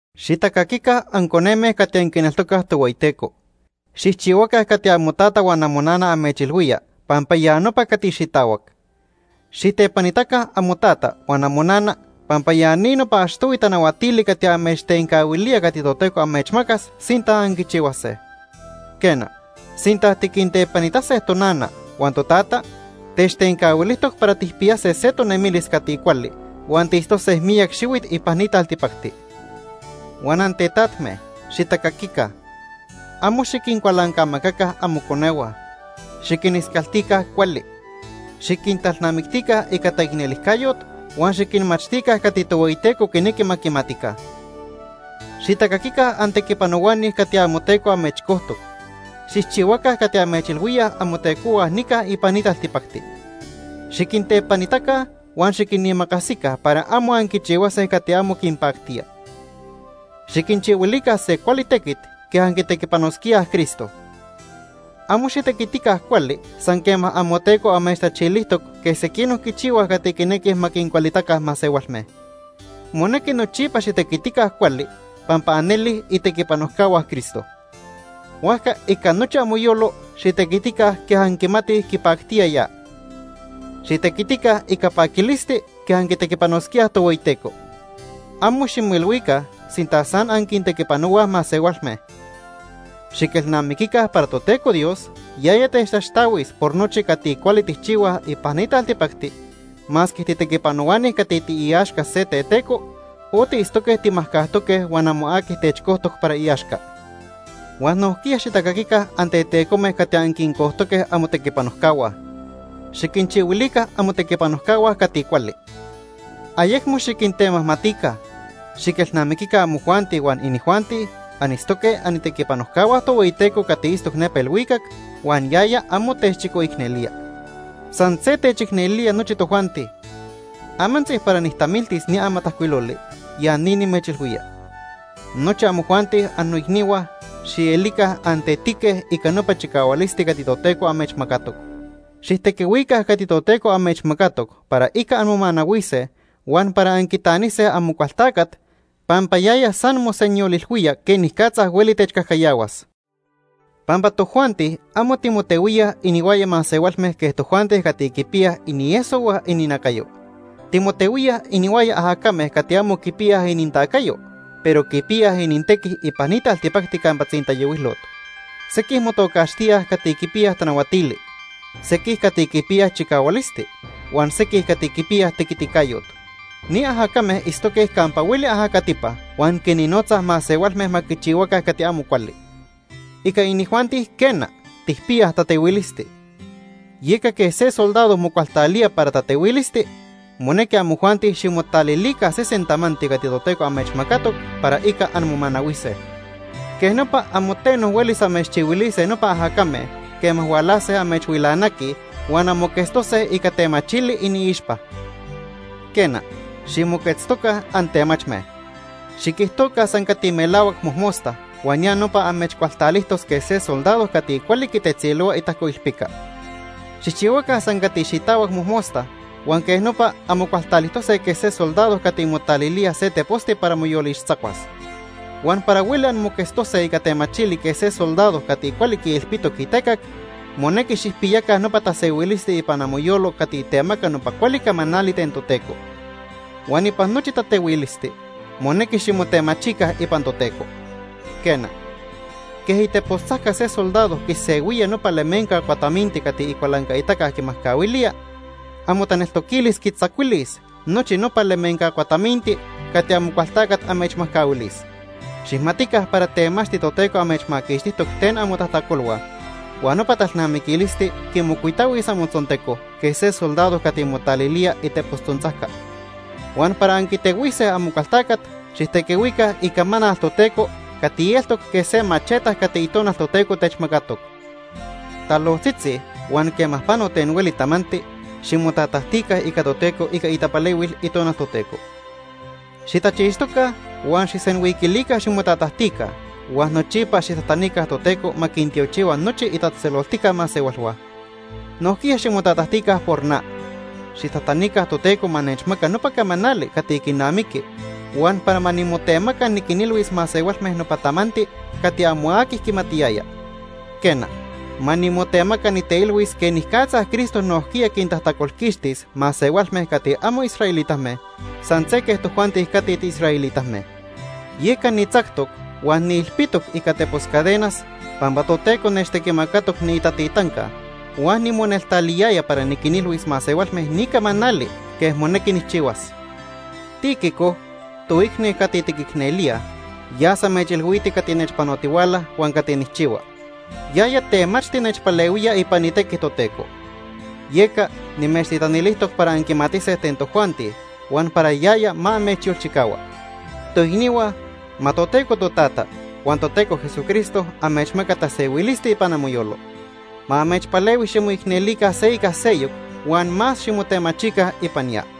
Xitacaquica anconeme cati anquineltocaj Tohueyiteco. Xijchihuaca cati amotata huan amonana amechilhuía pampa ya nopa cati xitahuac. Xijtepanitaca amotata huan amonana pampa ya ni nopa achtohui tanahuatili cati amechtencahuilía cati Toteco amechmacas sinta anquichihuase. Quena, sinta tiquintepanitase tonana huan totata, techtencahuilijtoc para tijpiyase se tonemilis cati cuali huan tiitztose miyac xihuit ipan ni taltipacti. Huan antetajme, xitacaquica. Amo xiquincualancamacaca amoconehua. Xiquiniscaltica cuali. Xiquintalnamictica ica taicnelijcayot huan xiquinmachtica cati Tohueyiteco quinequi ma quimatica. Xitacaquica antequipanohuani cati amoteco amechcojtoc. Xijchihuaca cati amechilhuíaj amotecohua nica ipan ni taltipacti. Xiquintepanitaca huan xiquinimacasica para amo anquichihuase cati amo quinpactía. Xiquinchihuilica se cuali tequit quej anquitequipanosquíaj Cristo. Amo xitequitica cuali san quema amoteco amechtachilijtoc quej sequinoc quichihuaj cati quinequij ma quincualitaca masehualme. Monequi nochipa xitequitica cuali pampa anelij itequipanojcahua Cristo. Huajca ica nochi amoyolo xitequitica quej anquimatij quipactía ya. Xitequitica ica paquilisti quej anquitequipanosquíaj Tohueyiteco. Amo ximoilhuica sinta san anquintequipanohuaj masehualme. Xiquelnamiquica para Toteco Dios yaya techtaxtahuis por nochi cati cuali tijchihuaj ipan ni taltipacti masque titequipanohuani cati tiiaxca se teteco o tiitztoque timajcajtoque huan amo aqui techcojtoc para iaxca. Huan nojquiya xitacaquica antetecome cati anquincojtoque amotequipanojcahua. Xiquinchihuilica amotequipanojcahua cati cuali. Ayecmo xiquintemajmatica. Xiquelnamiquica amojuanti huan inijuanti anitztoque anitequipanojcahua Tohueyiteco cati itztoc nepa ilhuicac huan yaya amo techchicoicnelía. San se techicnelía nochi tojuanti. Amantzi para nijtamiltis ni amatajcuiloli, ya ni nimechilhuía. Nochi amojuanti, annoicnihua, xielica antetique ica nopa chicahualisti cati Toteco amechmacatoc. Xijtequihuica cati Toteco amechmacatoc para ica anmomanahuise huan para anquitanise Amocualtacat pampa yaya san mosenyolilhuía quenicatza hueli techcajcayahuas. Pampa tojuanti amo timotehuíaj inihuaya masehualme quej tojuanti cati quipiyaj inieso huan ininacayo. Timotehuíaj inihuaya ajacame cati amo quipiyaj inintacayo, pero quipiyaj inintequi ipan ni taltipacti campa tzintayohuilot. Sequij motocaxtíaj cati quipiyaj tanahuatili, sequij cati quipiyaj chicahualisti, huan sequij cati quipiyaj tequiticayot. Ni ajacame itztoque campa hueli ajacatipa huan quinnotzaj masehualme ma quichihuaca cati amo cuali. Ica inijuanti, quena, tijpiyaj tatehuilisti. Yeca quej se soldado mocualtalía para tatehuilisti, monequi amojuanti ximotalilica sesen tamanti cati Toteco amechmacatoc para ica anmomanahuise. Quej nopa amo teno huelis amechchihuilise nopa ajacame quema hualase amechhuilanaquij huan anmoquetztose ica temachili iniixpa. Quena, ximoquetztoca antemachme. Xiquijtoca san cati melahuac mojmosta huan ya nopa amechcualtalijtos quej se soldado cati cuali quitetzilohua itajcoilpica. Xijchihuaca san cati xitahuac mojmosta huan quej nopa anmocualtalijtose quej se soldado cati motalilía se teposti para moyolixtzacuas. Huan para hueli anmoquetztose ica temachili quej se soldado cati cuali quiilpitoc itecac, monequi xijpiyaca nopa tasehuilisti ipan amoyolo cati temaca nopa cuali camanali ten Toteco. Huan ipan nochi tatehuilisti monequi ximotemachica ipan Toteco. Quena, quej itepostzajca se soldado quisehuía nopa lemenca cuataminti cati icualancaitaca quimajcahuilía, amotaneltoquilis quitzacuilis nochi nopa lemenca cuataminti cati Amocualtacat amechmajcahuilis. Xijmatica para temachti Toteco amechmaquixtijtoc ten amotajtacolhua huan nopa talnamiquilisti quimocuitahuis amotzonteco quej se soldado cati motalilía itepostzontzajca. Huan para anquitehuise Amocualtacat, xijtequihuica Icamanal Toteco cati eltoc quej se macheta cati Itonal Toteco techmacatoc. Talojtzitzi huan quema pano ten hueli tamanti, ximotatajtica ica Toteco ica itapalehuil Itonal Toteco. Xitachixtoca huan xijsenhuiquilica ximotatajtica huan nochipa xijtajtanica Toteco ma quintiochihua nochi itatzejtzeloltica masehualhua. Nojquiya ximotatajtica por na. Xijtajtanica Toteco ma nechmaca nopa camanali cati quinamiqui huan para ma nimotemaca niquinilhuis masehualme nopa tamanti cati amo aqui quimatiyaya. Quena, ma nimotemaca niteilhuis quenicatza Cristo nojquiya quintajtacolquixtis masehualme cati amo israelitame san se quej tojuanti cati tiisraelitame. Yeca nitzactoc huan niilpitoc ica tepos cadenas pampa Toteco nechtequimacatoc niitatitanca huan nimoneltaliyaya para niquinilhuis masehualme ni camanali quej monequi nijchihuas. Tíquico, toicni cati tiquicnelíaj yas amechilhuiti cati nechpanotihuala huan cati nijchihua. Yaya temachti nechpalehuía ipan itequi Toteco. Yeca nimechtitanilijtoc para anquimatise ten tojuanti huan para yaya ma amechyolchicahua. Toicnihua, ma Toteco Totata huan Toteco Jesucristo amechmaca tasehuilisti ipan amoyolo. Ma amechpalehui ximoicnelica se ica seyoc huan más ximotemachica ipan ya.